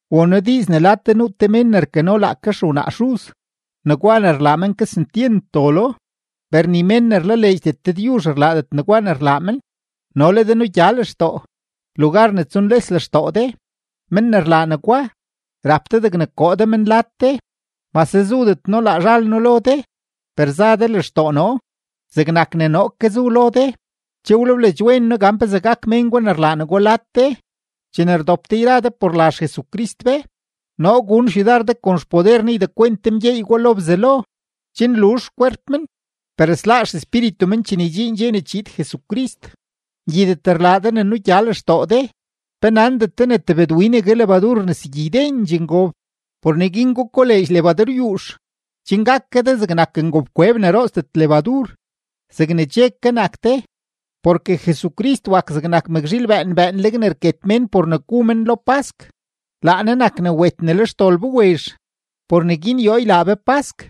Won noo diiz ne lad de nuu te mén ne rkano laake xewnaa xuz. Negwa ne rlaa men, kesentyent dolo, per ni mén ne rlaleedxdet Dëdyuzh rlaadet negwa ne rlaa men. ¡No le de nugya lextoo, lugar ne tsunles lextoo de! Men ne rlaa negwa, rap de degne koo de men lad de. Mase zudet noo laa zhal noo lo de, per za de lextoo noo; zegnak ne noo ke zu lo de, che wlebleedx wen noo gan pezee gak mén gwa ne rlaa negwa lad de. Chene rdop de yra de por la XJesucrist be, noo gun xyudar de kon xpoder Ne ydekwent de mgyeey gwa lo Bzelo, chen luzh xkwerp men, per sláá xespíritu men chene ydxiin dxe ne chiid Jesucrist. Ngyidet rlaa de ne nugya lextoo de. ¿Pe nandet de ne tebëdwinegue lebadur rnesegyi ydendxee ngob? Por neguin gukoleedx lebaduryuux, chen gak ke de zegnak ngobkweb ne rootsdet lebadur zegne che ke nak de. Porke Jesucrist wak zegnak mëkzhiil bëën bëënleg ne rket mén por ne gu men lo pask, laa Ne nak ne wet ne le xdol be wezh. Por neguin yoo ylaa be pask,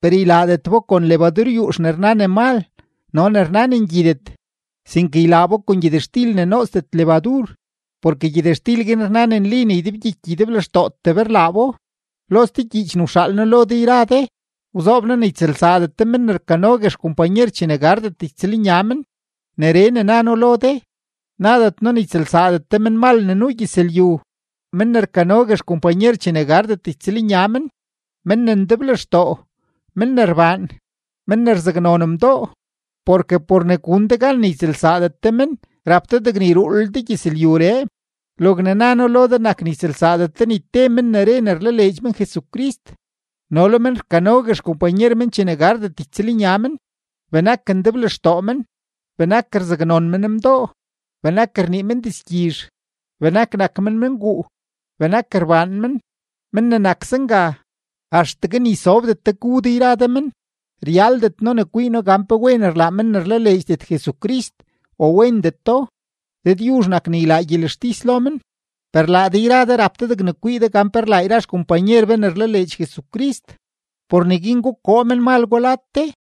per ylaadet bo kon lebaduryuux ne rna ne mal no ne rna ne ngyidet, sinke ylaa bo kon gyëtxtil ne nootsdet lebadur porke gyëtxtil guin rna ne nli ne ydebgyiky ydeblextootee be rlaa bo. Lo ste gyiich ne wxaal noo lo de yra de, wzoob noo ne ytsëlsaadet de men ne rkanogue xkompanyer chene gardet ytsëlnya men. Neree ne na noo lo de, nadet noo ne ytsëlsaadet de menmal ne nuu gyëzlyu, men ne rkanogue xkompanyer chene gardet ytsëlnya men, men ne ndeblextoo, men ne rbaan, men ne rzaknon mdoo; porke por ne gun de gan ne ytsëlsaadet de men, rap de degne yruulel de gyëzlyuree. Logne na noo lo de nak ne ytsëlsaadet de ni te men ne re ne rlaleedx men Jesucrist no le men rkanogue xkompanyer chene gardet ytsëlnya men, benak ndeblextoo men, benak rzaknon men mdoo, benak rnii men dizgyizh, benak nak men menguu, benak rbaan men. Men ne nak zenga, axtegue ni sobdet de gu de yra de men. Ryaldet noo ne kwii noo gan pe wen rlaa men ne rlaleedxdet Jesucrist o wendeto; Dëdyuzh nak ne ylaa gyelextis lo men. Per laa de yra de rap de degne kwii de gan pe rlaa yra xkompanyer be ne rlaleedx Jesucrist. Por neguin gukoo menmal gwa lad de.